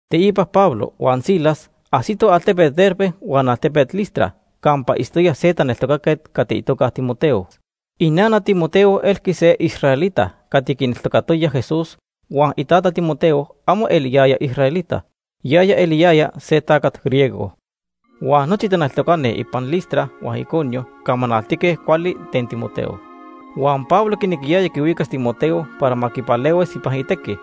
Teipa Pablo huan Silas ajsitoj altepet Derbe huan altepet Listra campa itztoya se taneltocaquet cati itoca Timoteo. Inana Timoteo elqui se israelita cati quineltocatoya Jesús huan itata Timoteo amo ya se israelita, yaya se tacat griego. Huan nochi taneltocani ipan Listra huan Iconio camanaltique cuali ten Timoteo. Huan Pablo quinequiyaya quihuicas Timoteo para ma quipalehuis ipan itequi,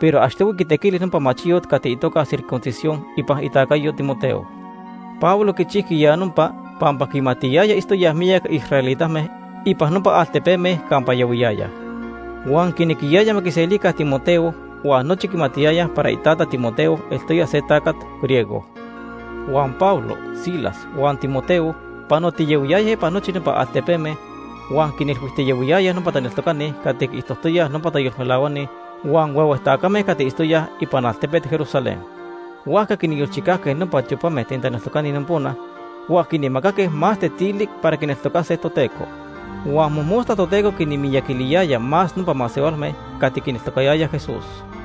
pero achtohui quitequili nopa machiyot cati itoca circuncisión ipan itacayo Timoteo. Pablo quichijqui ya nopa pampa quimatiyaya itztoyaj miyac israelitame ipan nopa altepeme campa yahuiyayaj. Huan quinequiyaya ma quiselica Timoteo, huan nochi quimatiyayaj para itata Timoteo eltoya se tacat griego. Huan Pablo, Silas huan Timoteo panotiyahuiyayaj ipan nochi nopa altepeme huan quinilhuijtiyahuiyayaj nopa taneltocani cati quiijtojtoyaj nopa tayolmelahuani huan huehue tacame cati itztoyaj ipan altepet Jerusalén. Huajca quinyolchicajque nopa tiopame ten taneltocani nopona huan quinmacaque más tetili para quineltocase Toteco. Huan mojmosta Toteco quinmiyaquiliyaya más nopa masehualme cati quineltocayayaj Jesús.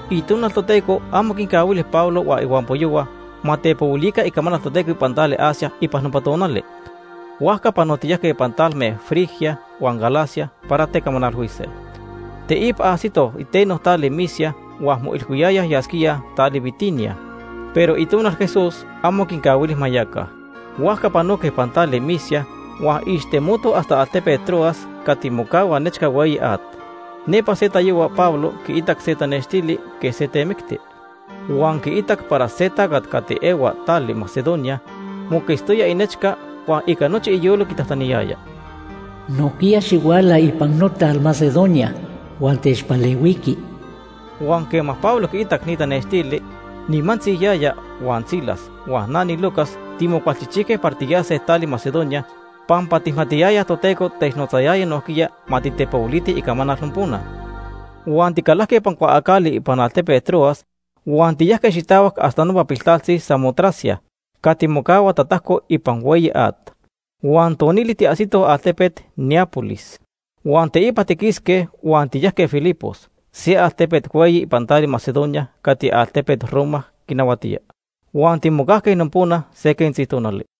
Itonal Toteco amo quincahuili Pablo huan ihuampoyohua ma tepohuilica icamanal Toteco ipan tali Asia ipan nopa tonali. Huajca panotiyajque ipan talme Frigia huan Galacia para tecamanalhuise. Teipa ajsitoj iteno tali Misia huan moilhuiyayaj yasquíaj tali Bitinia, pero Itonal Jesús amo quincahuili ma yaca. Huajca panoque ipan tali Misia huan ixtemotoj hasta altepet Troas cati mocahua nechca hueyi at. Nepa se tayohua Pablo quiitac se tanextili quej se temicti. Huan quiitac para se tacat cati ehua tali Macedonia moquetztoya inechca huan ica nochi iyolo quitajtaniyaya: “Nojquiya xihuala ipan notal Macedonia huan techpalehuiqui.” Huan quema Pablo quiitac ni tanextili, nimantzi yaya huan Silas huan na niLucas timocualchijchijque para tiyase tali Macedonia, pampa tijmatiyayaj Toteco technotzayaya nojquiya ma titepohuilitij icamanal nopona. Huan ticalajque ipan cuaacali ipan altepet Troas huan tiyajque xitahuac hasta nopa piltaltzi Samotracia cati mocahua tatajco ipan hueyi at, huan tonili tiajsitoj altepet Neápolis. Huan teipa tiquisque huan tiyajque Filipos, se altepet hueyi ipan tali Macedonia cati altepet Roma quinahuatía. Huan timocajque nopona se quentzi tonali.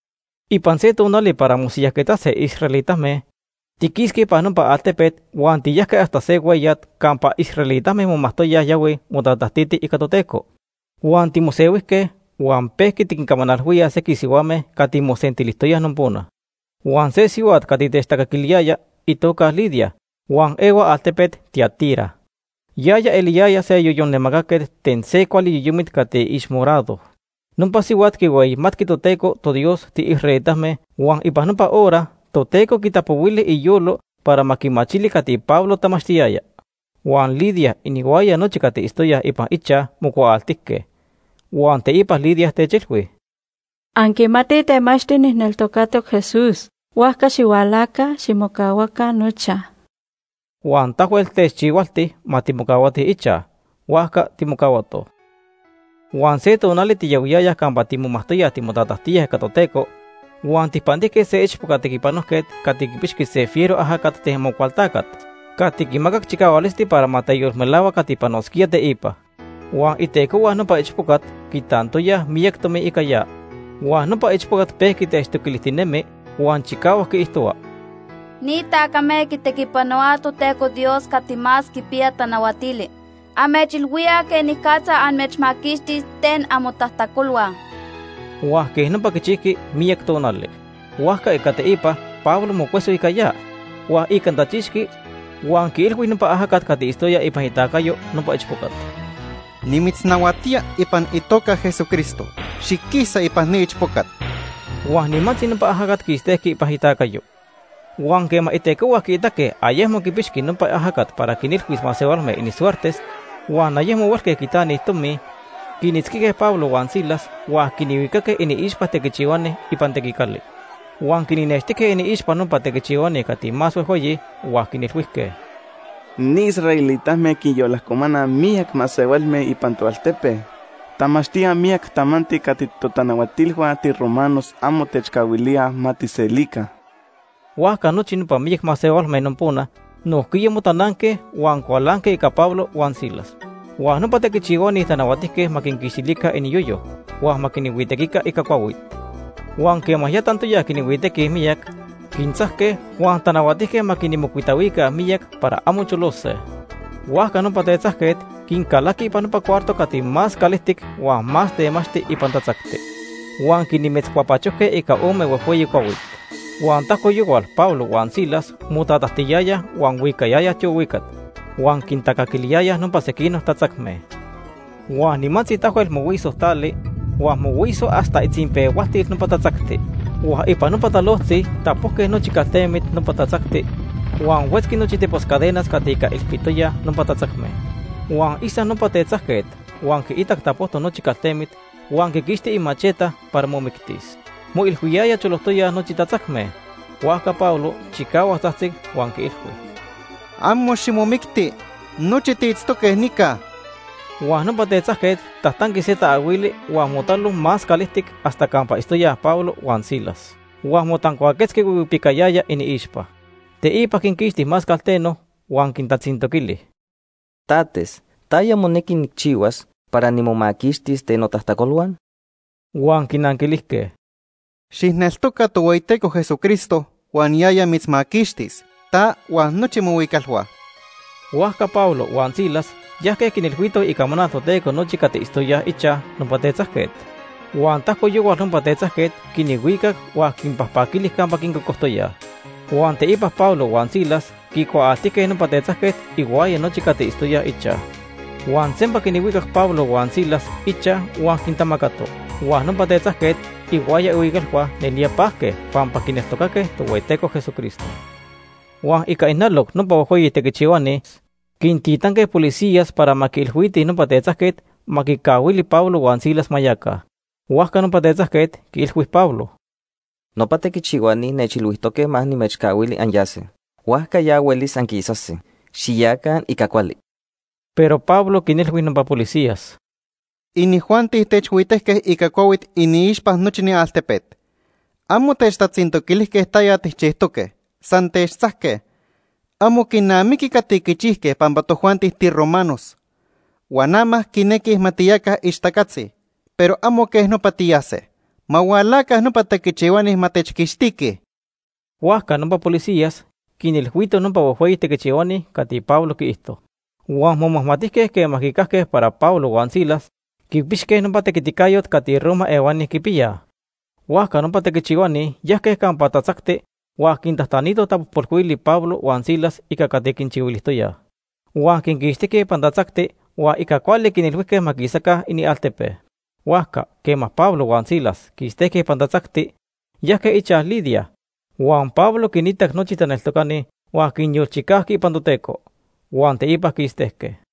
Ipan se tonali para mosiyajquetzase israelitame, tiquisque ipan nopa altepet huan tiyajque hasta se hueyat campa israelitame momajtoyaj yahuij motatajtitij ica Toteco. Huan timosehuijque huan pejqui tiquincamanalhuíaj sequij sihuame cati mosentilijtoyaj nopona. Huan se sihuat cati techtacaquiliyaya itoca Lidia huan ehua altepet Tiatira. Yaya eliyaya se yoyon namacaquet ten se cuali yoyomit cati ixmorado. Nopa sihuat quihueyimatqui Toteco toDios tiisraelitame huan ipan nopa hora Toteco quitapohuili iyolo para ma quimachili cati Pablo tamachtiyaya. Huan Lidia inihuaya nochi cati itztoyaj ipan ichaj mocuaaltijque. Huan teipa Lidia techilhui: ―Anquimatij temachti nijneltocatoc Jesús, huajca xihualaca, ximocahuaca nochaj. Huan tahuel techchihualti ma timocahuatij ichaj. Huajca timocahuatoj. Huan se tonali tiyahuiyayaj campa timomajtoyaj timotatajtíaj ica Toteco huan tijpantijque se ichpoca tequipanojquet cati quipixqui se fiero ajacat ten Amocualtacat cati quimacac chicahualisti para ma teyolmelahua cati panosquía teipa. Huan itecohua nopa ichpocat quitantoyaj miyac tomi ica ya. Huan nopa ichpocat pejqui techtoquilijtinemi huan chicahuac quiijtohua: ―Ni tacame quitequipanohuaj Toteco Dios Cati Más Quipiya Tanahuatili. Amechilhuíaj quenicatza amechmaquixtis ten amotajtacolhua. Huan quej nopa quichijqui miyac tonali. Huajca ica teipa Pablo mocueso ica ya huan icantachixqui huan quiilhui nopa ajacat cati itztoya ipan itacayo nopa ichpocat: ―Nimitznahuatía ipan itoca Ica itequiticayo. Jesucristo, xiquisa ipan ni ichpocat. Huan nimantzi nopa ajacat quistejqui ipan itacayo. Huan quema itecohua quiitaque ayecmo quipixqui nopa ajacat para quinilhuis masehualme inisuertes huan ayecmo huelque quitanij tomi, quinitzquijque Pablo huan Silas huan quinhuicaque iniixpa tequichihuani ipan tequicali. Huan quinixnextijque iniixpa nopa tequichihuani cati más huejhueyi huan quinilhuijque: ―Ni israelitame quinyolajcomanaj miyac masehualme ipan toaltepe. Tamachtíaj miyac tamanti cati totanahuatilhua tiromanos amo techcahuilíaj ma tijselica. Huajca nochi nopa miyac masehualme nopona nojquiya motananque por Pablo huan Silas. Huan nopa tequichihuani tanahuatijque ma quinquixtilica iniyoyo, huan ma quinhuitequica ica cuahuit. Huan quema ya tantoyaj quinhuitequij miyac, quintzajque huan tanahuatijque ma quinmocuitahuica miyac para amo cholose. Huajca nopa tetzajquet quincalaqui ipan nopa cuarto cati más calijtic huan más temachti ipan tatzacti. Huan quinmetzcuapachojque ica ome huejhueyi cuahuit. Huan tajco yohual Pablo huan Silas motatajtiyayaj huan huicayayaj tiohuicat huan quintacaquiliyayaj nopa sequinoc tatzacme. Huan nimantzi tahuel mohuisoj tali huan mohuisoj hasta itzinpehualtil nopa tatzacti. Huan ipan nopa talojtzi tapojque nochi caltemit nopa tatzacti huan huetzqui nochi tepos cadenas cati ica ilpitoyaj nopa tatzacme. Huan isac nopa tetzajquet, huan quiitac tapojtoc nochi caltemit huan quiquixti imacheta para momictis. Moilhuiyaya cholojtoyaj nochi tatzacme. Huajca Pablo chicahuac tzajtzic huan quiilhui: ―Amo ximomicti. Nochi tiitztoque nica. Huan nopa tetzajquet tajtanqui se taahuili huan motalo más calijtic hasta campa itztoyaj Pablo huan Silas. Huan motancuaquetzqui huihuipicayaya iniixpa. Teipa quinquixti más calteno huan quintatzintoquili: ―Tates, ¿taya monequi nijchihuas para nimomaquixtis ten notajtacolhua? Huan quinanquilijque: ―Xijneltoca Tohueyiteco Jesucristo huan yaya mitzmaquixtis, ta huan nochi mohuicalhua. Huajca Pablo huan Silas yajque quinilhuitoj icamanal Toteco nochi cati itztoyaj ichaj nopa tetzajquet. Huan tajco yohual nopa tetzajquet quinhuicac huan quinpajpaquili campa quincocojtoyaj. Huan teipa Pablo huan Silas quicuaaltijque nopa tetzajquet ihuaya nochi cati itztoyaj ichaj. Huan sempa quinhuicac Pablo huan Silas ichaj huan quintamacato. Huan nopa tetzajquet ihuaya ihuicalhua nelía pajque pampa quineltocaque Tohueyiteco Jesucristo. Huan ica ijnaloc nopa huejhueyi tequichihuani quintitanque policías para ma quiilhuitij nopa tetzajquet ma quicahuili Pablo huan Silas ma yaca. Huajca nopa tetzajquet quiilhui Pablo: ―Nopa tequichihuani nechilhuijtoque ma nimechcahuili anyase. Huajca ya huelis anquisase. Xiyaca ica cuali. Pero Pablo quinilhui nopa policías: ―Inijuanti techhuitejque ica cuahuit iniixpa nochi ni altepet. Amo techtatzintoquilijque taya tijchijtoque, san techtzajque. Amo quinamiqui cati quichijque pampa tojuanti tiromanos. Huan ama quinequij ma tiyaca ixtacatzi, pero amo quej nopa tiyase. Ma hualaca nopa tequichihuani ma techquixtiquij. Huajca nopa policías quinilhuitoj nopa huejhueyi tequichihuani cati Pablo quiijto. Huan momajmatijque quema quicajque para Pablo huan Silas quipixque nopa tequiticayot cati Roma ehuani quipiyaj. Huajca nopa tequichihuani yajque campa tatzacti huan quintajtanitoj tapojpolhuili Pablo huan Silas ica cati quinchihuilijtoyaj. Huan quinquixtijque ipan tatzacti huan ica cuali quintajtanijque ma quisaca inialtepe. Huajca quema Pablo huan Silas quistejque ipan tatzacti, yajque ichaj Lidia. Huan Pablo quinitac nochi taneltocani huan quinyolchicajqui ipan Toteco. Huan teipa quistejque.